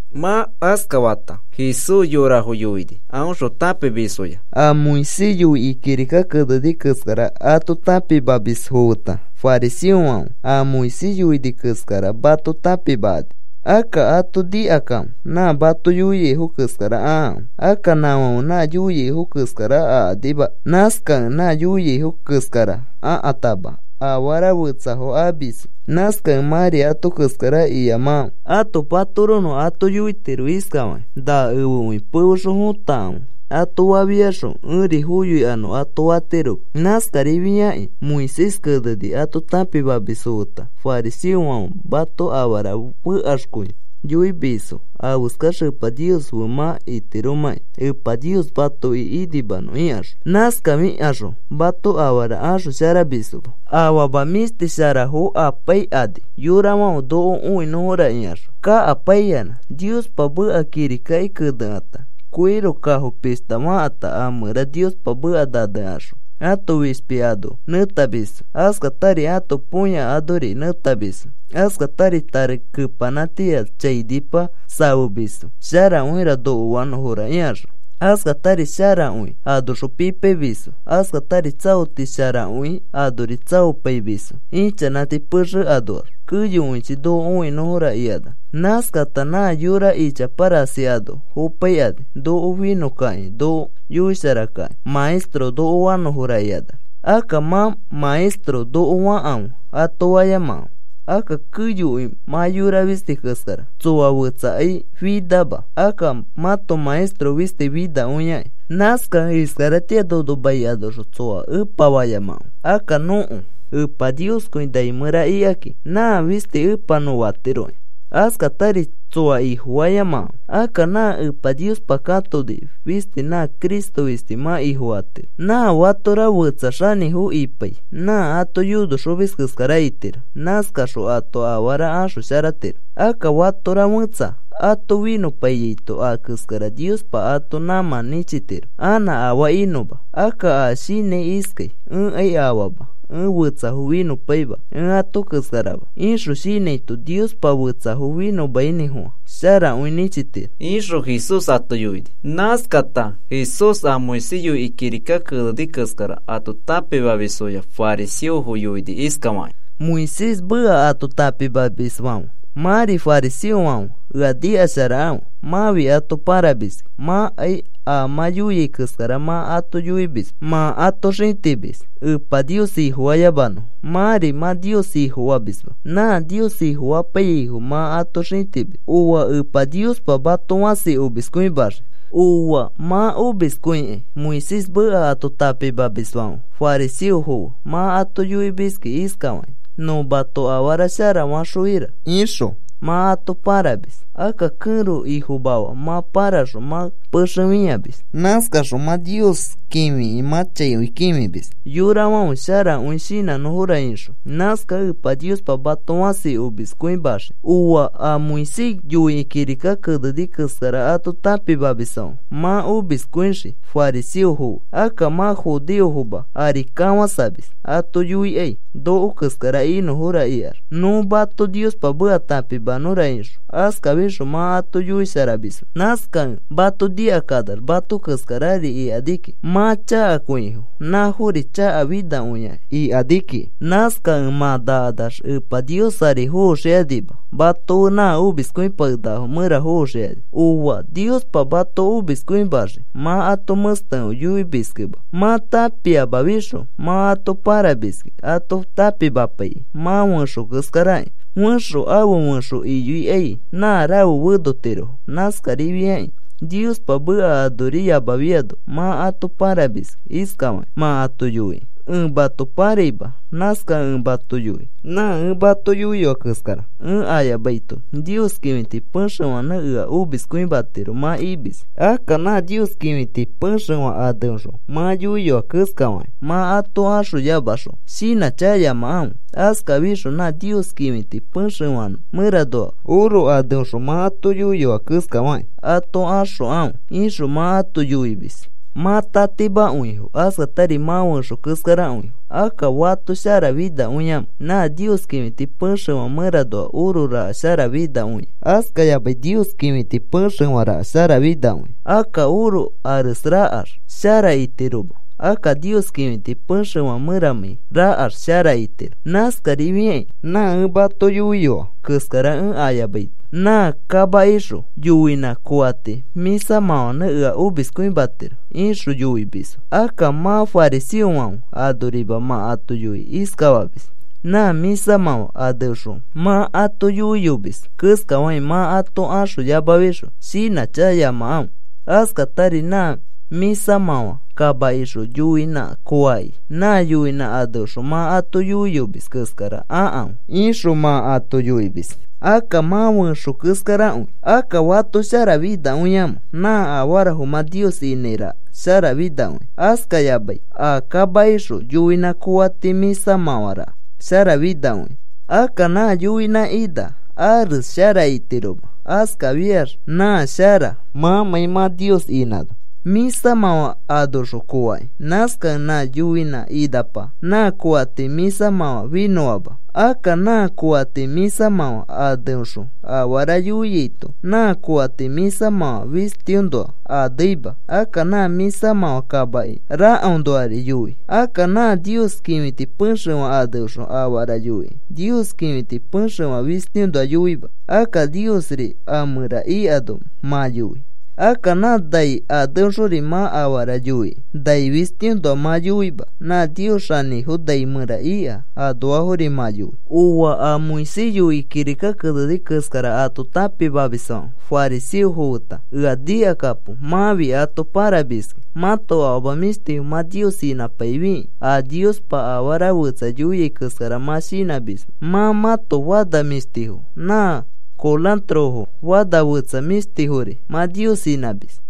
Mã askafata Jesús yorafo yoini aõxõ tãpimisfoya: “A Moisés yoikĩ kirika keneni keskara ato tãpimamisfo feta fariseofãfe a Moisés yoini keskara mato tãpimakani. Akka ato nikakãfe. Nã mato yoiaifo keskara akãfe. Akka nãfãfe nã yoiaifo keskara akanima. Nãskakẽ nã yoiaifo keskara akãtama afara fetsafo amisfo. Nãskakẽ mãri ato keskara iyamakãfe. Ãto patoronõ ato yoitiro iskafakĩ: ‘Na efekõi pefexõ fõtakãfe,’ ato fafiaxõ ẽri foyoikanõ ato fatiroma. Nãskarifiakĩ a Moisés keneni ato tãpimamisfo feta fariseofãfe mato afara fekaxkõi yoimisfo afeskax Epa Nios fe mã itiromãkĩ Epa Nios matoki inimanõ ikaxõ. Nãskafikaxõ mato afara axosharamisfoma. Afama mĩshti sharafo apaikani yorafãfe noko õinõfora ikaxõ kakapaiyanã. Niospa meka kirikaki kenekata koiro kafo pishta fakãta a mẽra Niospa meka nanekaxõ ãto fishpi ano nẽtamisfo. Askatari ãto põya anori nẽtamisfo. Askatari tari kepanãtia chainipa safemisfo sharakõira noko fanõfo ikaxõ. Askatari sharakõi anoxõ pipaimisfo, askatari tsaoti sharakõi anori tsaopaimisfo ichanãti pexe anoax, keyokõichi noko õinõfora ikanax. Nãskakata nã yora ichapa rasi ano fopaikani noko finõkakĩ noko yoisharakakĩ, ‘Maestro noko fanõfora,’ ikanax. “Akka mã, ‘Maestro, noko fakãfe,’ ato fayamakãfe. Akka keyokõi mã yora fisti keskara. Tsoa fetsakai finama. Akka mãto Maestro fisti finakõiaki. Nãskakẽ iskaratĩa nono mai anoxõ tsoa Ẽpa fayamakãfe. Akka nõko Epa Nioskõi nai mẽra ikaki. Nã fisti Epa nõ fatiroki. Askatari tsoa ifofayamakãfe. Akka nã Epa Niospa katoni fisti na Cristo fisti mã Ifofatiro. Nã fatora fetsa xanĩfo ipai nã ato yonoxomis keskara itiro. Nãskaxõ ato afara axosharatiro. Akka fatora fẽtsa ato finõpaiyaito a keskara Niospa ato nãmã nĩchitiro anã afaa inõma. Akka a shinãi iskai: ‘Ẽkai afama, ẽ fetsafo finõpaima, ẽ ato keskarama,’ ixõ shinãito Niospa fetsafo finõmainĩfofã sharakõi nĩchitiro,” ixõ Jesús ato yoini. Nãskata Jesús a Moisés yoikĩ kirika keneni keskara ato tãpimamisfoya fariseofo yoini iskafakĩ: “Moisés meka ato tãpimamisfãfe, mãri fariseofãfe ea nikasharakãfe. Mãfi ato pãrapaimiski. Mãkai a mã yoia keskara mã ato yoimisma. Mã ato xĩtimis Epa Nios Ifofayamanõfo. Mãri mã Nios Ifofamisma. Nã Nios Ifofapaiyaifo mã ato xĩtimis. ¡Ooa! Epa Niospa mato fãsi omiskõimaxii. “¡Ooa! Mã omiskõikai, Moisés meka ato tãpimamisfãfe fariseofo fe. Mã ato yoimiski iskafakĩ: ‘Nõ mato afara shara faxõira,’ ixõ mã ato pãramis. Akka kẽro ifomafa mã pãraxõ mã pexe fĩamis. Nãskaxõ mã Nios kĩfikĩ mã chaikõi kĩfimis yorafãfe sharakõi shinãnõfora ixõ. Nãskakẽ Epa Niospa mato fãsi omiskõimaxii. “¡Ooa, a Moisés yoikĩ kirika keneni keskara ato tãpimamisfãfe, mã omiskõixii fariseofo fe! Akka mã judeofoma ari kafãsamis ato yoikai noko keskara inõfora ikax, nõ mato Niospa meka tãpimanõra ixõ. Askafixõ mã ato yoisharamisma. Nãskakẽ mato nikakanax mato keskarari ikani kiki. Mã chakakõifo nãfori chakafinakõia ikani kiki. Nãskakẽ mã nakanax Epa Nios ari foxikanima. Mato fe nã omiskõipakenakafo mẽra foxikani. “¡Ooa! Niospa mato omiskõimaxii, mã ato mẽstekõi yoimiskẽma. Mã tãpiamafixõ mã ato paramiski ato tãpimapaikĩ. Mã fẽxo keskarakĩ fẽxo afe fẽxo iyoikai nã rafe fenotirofo. Nãskarifiakĩ Niospa meka anoriyamafiano mã ato paramiski iskafakĩ mã ato yoikĩ: ‘Ẽ mato paraima. Nãskakẽ ẽ mato yoi, nã ẽ mato yoiyoa keskara ẽ ayamaito Nios kĩfiti pexefãnẽ ea omiskõimatiro,’ mã imis. ‘Akka nã Nios kĩfiti pexefã aneõxõ mã yoiyoa keskafakĩ mã ato axoyamaxõ shinãchakayamakãfe. Askafixõ nã Nios kĩfiti pexefã mẽranoa oro aneõxõ mã ato yoiyoa keskafakĩ ato axokãfe,’ ixõ mã ato yoimis. Mã tatimakõifo, askatari mã fẽxo keskarakõifo. Akka, ¿fato sharafinakõiamẽ? Nã Nios kĩfiti pexefã mẽranoa oro raka sharafinakõia, askayamai Nios kĩfiti pexefã raka sharafinakõia. Akka oro ares rakax shara itiroma. Akka Nios kĩfiti pexefã mẽramãi rakax shara itiro. “Nãskarifiakĩ, ‘Nã ẽ mato yoiyoa keskara ẽ ayamaito nã a kamakixõ yoinã koati mĩsamãfãnẽ ea omiskõimatiro,’ ixõ yoimisfo. Akka mã fariseofãfe, anorima mã ato yoikĩ iskafamis: ‘Nã mĩsamãfã aneõxõ mã ato yoiyomis keskafakĩ mã ato axoyamafixõ shinãchakayamakãfe. Askatari nã mĩsamãfã kamakixõ yoinã koaki nã yoinã aneõxõ mã ato yoiyomis keskara akãfe,’ ixõ mã ato yoimis. “Akka mã fẽxo keskarakõi. Akka, ¿fato sharafinakõiamẽ? Nã afarafo mã Nios inãi raka sharafinakõia, askayamai a kamakixõ yoinã koati mĩsamãfã raka sharafinakõia. Akka nã yoinã ina ares shara itiroma. Askafiax nã shara, mãmãi mã Nios inãno mĩsamãfã anoxõ koakĩ. Nãskakẽ nã yoinã inapa nã koati mĩsamãfã finõama. Akka nã koati mĩsamãfã aneõxõ afara yoiaito nã koati mĩsafã fistiõnoa aneima. Akka nã mĩsamãfã kamaki rakaõnoari yoi. Akka nã Nios kĩfiti pexefã aneõxõ afara yoikĩ Nios kĩfiti pexefã fistiõnoa yoima. Akka Niosri a mẽra ikano mã yoi. Akka nã nai aneõxori mã afara yoikĩ, nai fistiõnoa mã yoima. Nã Nios Xanĩfo nai mẽra ika anoafori mã yoi. “¡Ooa, a Moisés yoikĩ kirika keneni keskara ato tãpimamisfãfe fariseofo feta! Ea nikakapo. Mãfi ato parapaimiski. Mãto afama mĩshtifo mã Nios inãpaifikĩ a Niospa afara fetsa yoia keskara mã shinãmisma. Mã mãto fana mĩshtifo nã korãtorofo fana fetsa mĩshtifori mã Nios inãmis.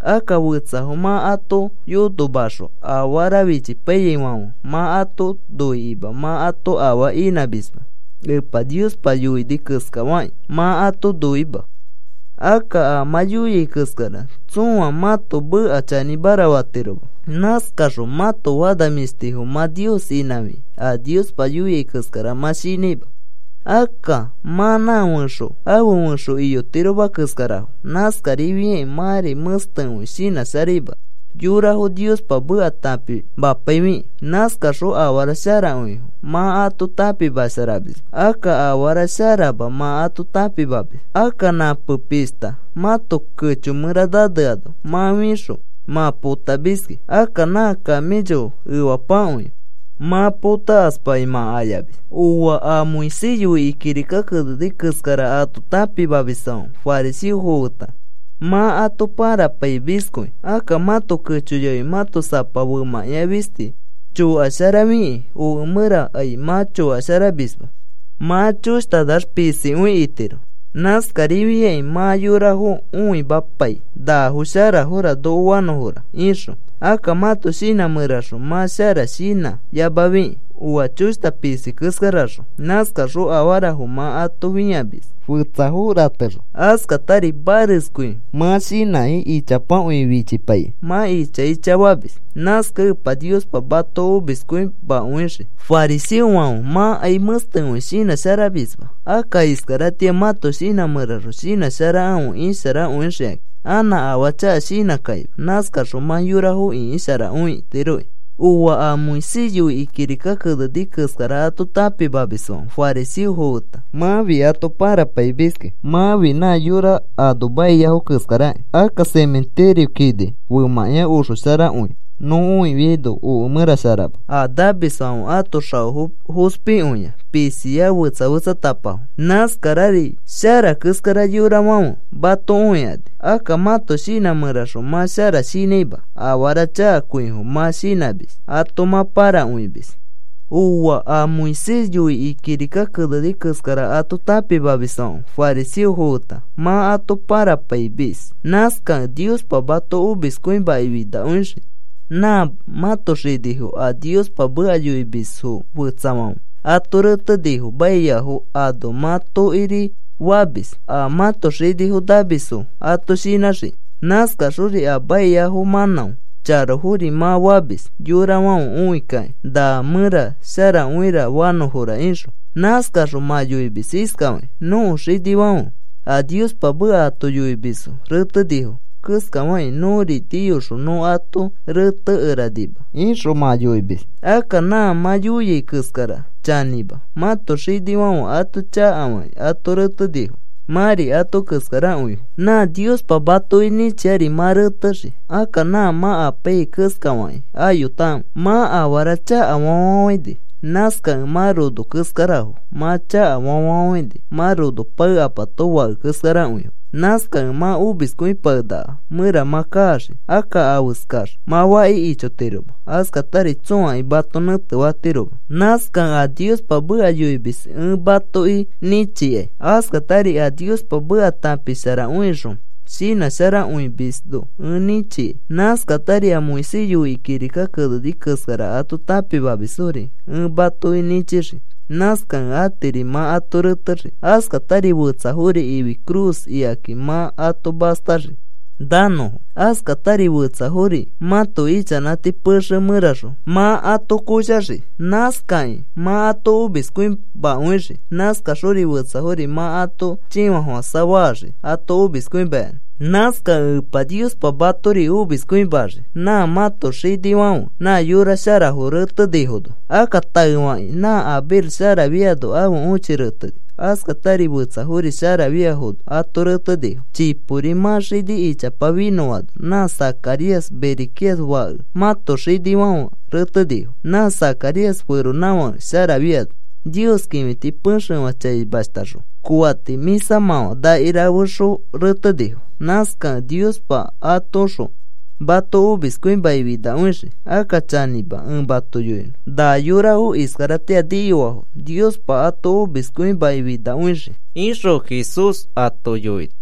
Akka fetsafo mã ato yonomaxõ afara fichipaifiaifãfe mã ato noikima mã ato afaa inãmisma. Epa Niospa yoini keskafakĩ mã ato noima. Akka a mã yoiai keskara tsõa mãto meka chanĩmara fatiroma. Nãskaxõ mãto fana mĩshtifo mã Nios inãfikĩ a Niospa yoia keskara mã shinãima. Akka mã nã fẽxo afe fẽxo iyotiroma keskarafo. Nãskarifiakĩ mãri mẽstekõi shinãsharaima yorafo Niospa meka tãpimapaifikĩ. Nãskaxõ afara sharakõifo mã ato tãpimasharamisma. Akka afara sharama mã ato tãpimamis. Akka nãpe pishta mãto kecho mẽra naneano, mã fixõ mã potamiski. Akka nã camello efapakõi mã potakaspakĩ mã ayamis. “¡Ooa, a Moisés yoikĩ kirika keneni keskara ato tãpimamisfãfe fariseofo feta! Mã ato parapaimiskõi. Akka mãto kecho yafi mãto sapa femãkĩa fisti chokasharafikĩ, oke mẽrakai mã chokasharamisma, nachoshtax pisikõi itiro. Nãskarifiakĩ mã yorafo õimapai nafo sharafora noko fanõfora ixõ. Akka mãto shinã mẽraxõ mã shara shinãyamafikĩ, oa choshta pisi keskaraxõ. Nãskaxõ afarafo mã ato fĩamis fetsafo ratexõ. Askatari mareskõi mã shinãkĩ, ichapakõi fichipaikĩ mã icha icha famis. Nãskakẽ Epa Niospa mato omiskõimakõixii. Fariseofãfe, mãkai mẽstekõi shinãsharamisma. Akka iskaratĩa mãto shinã mẽraxõ shinãsharakãfe, isharakõixikakĩ. Anã afaa chaka shinãkakima. Nãskaxõ mã yorafo ĩkisharakõitiroki. “¡Ooa, a Moisés yoikĩ kirika keneni keskara ato tãpimamisfãfe, fariseofo feta! Mãfi ato parapaimiski. Mãfi nã mafa kini keskaraki. Akka mafa kini femãkĩa oxo sharakõi nõ õifiaino oke mẽra sharama. A namisfãfe ãto xaofo fospikõia pisia fetsa fetsatapafo. Nãskarari shara keskara yorafãfe mato õikani. Akka mãto shinã mẽraxõ mã shara shinãima. Afara chakakõifo mã shinãmis, ato mã parakõimis. “¡Ooa, a Moisés yoikĩ kirika keneni keskara ato tãpimamisfãfe, fariseofo feta! Mã ato parapaimis. Nãskakẽ Niospa mato omiskõimakĩ finakõixii. Nã mãto xinifo a Niospa meka yoimisfo fetsafãfe ato retenifo maiafo ano mã tokiri famis a mãto xinifo namisfo ato shinãxikĩ. Nãskaxori a maiafo mãnão charofori mã famis yorafãfe õikakĩ na mẽra sharakõira fanõfora ixõ. Nãskaxõ mã yoimis iskafakĩ: ‘Nõko xinifãfe a Niospa meka ato yoimisfo retenifo keskafakĩ nõri niyoxõ nõ ato retekeranima,’ ixõ mã yoimis. Akka nã mã yoiai keskara chanĩma. Mãto xinifãfe ato chakafakĩ ato retenifo. Mãri ato keskarakõifo. Nã Niospa matoki nĩchiari mã retexii. Akka nã mã apaiyai keskafakĩ ayotakãfe. “Mã afara chakafa fafafãini. Nãskakẽ mã rono keskarafo. Mã chakafa fafafãini. Mã rono paekapato fake keskarakõifo. Nãskakẽ mã omiskõipakenakafo mẽra mã kaxii. Akka afeskax mã faki ichotiroma. Askatari tsõakai mato nẽtefatiroma. Nãskakẽ a Niospa meka yoimis ẽ matoki nĩchikai. Askatari a Niospa meka tãpisharakõixõ shinãsharakõimisno ẽ nĩchikai. Nãskatari a Moisés yoikĩ kirika keneni keskara ato tãpimamisfori ẽ matoki nĩchixii. Nãskakẽ atiri mã ato retexii. Askatari fetsafori ifi cruz ikaki mã ato mastaxii nanõfo. Askatari fetsafori mãto ichanãti pexe mẽraxõ mã ato koshaxii. Nãskakĩ mã ato omiskõimakõixii. Nãskaxori fetsafori mã ato chĩfafofãsa faxii ato omiskõimayanã. Nãskakẽ Epa Niospa matori omiskõimaxii nã mãto xinifãfe nã yora sharafo retenifono. Akka taefakĩ nã Abel sharafiano ãfe õchi reteni. Askatari fetsafori sharafiafono ato retenifo. Chipori mã xini ichapa finõano nã Zacarías, Berequías fake, mãto xinifãfe retenifo. Nã Zacarías feronãfake sharafiano Nios kĩfiti pexefã chaimashtaxõ koati mĩsamãfã nakirafexõ retenifo. Nãskakẽ Niospa atoõxõ mato omiskõimaki finakõixii. Akka chanĩma ẽ mato yoinõ. Na yorafo iskaratĩa niyoafo Niospa ato omiskõimaki finakõixii,” ixõ Jesús ato yoini.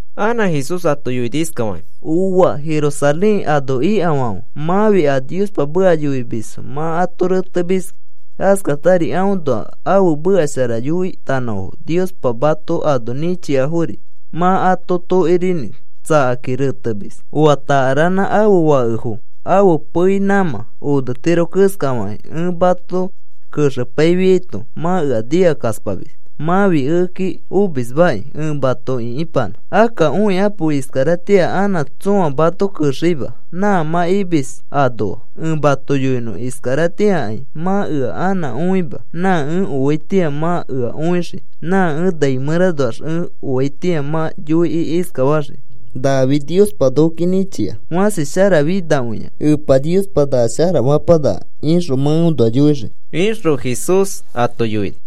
Anã Jesús ato yoini iskafakĩ: “¡Ooa, Jerusalén ano ikafãfe! Mãfi a Niospa meka yoimisfo mã ato retemiski. Askatari aõnoa ãfe meka shara yoitanõfo Niospa mato ano nĩchiafori mã ato tokorinĩ tsakakĩ retemis. Oa takaranã ãfe fakefo ãfe pei nãmã onetiro keskafakĩ ẽ mato kexepaifiaito mã ea nikakaspamis. Mãfi ekeki omismakĩ ẽ mato ĩkipanã. Akka õikapo, iskaratĩa anã tsõa mato kexeima nã mã imis anoa. Ẽ mato yoinõ, iskaratĩakai mã ea anã õima. Nã ẽ oaitĩa mã ea õixii. Nã ẽ nai mẽranoax ẽ oaitĩa mã yoikĩ iskafaxii: ‘Nafi Niospa nokoki nĩchia. Fãsi sharafinakõia Epa Niospa na shara fapanaka,’ ixõ mã eõnoa yoixii,” ixõ Jesús ato yoini.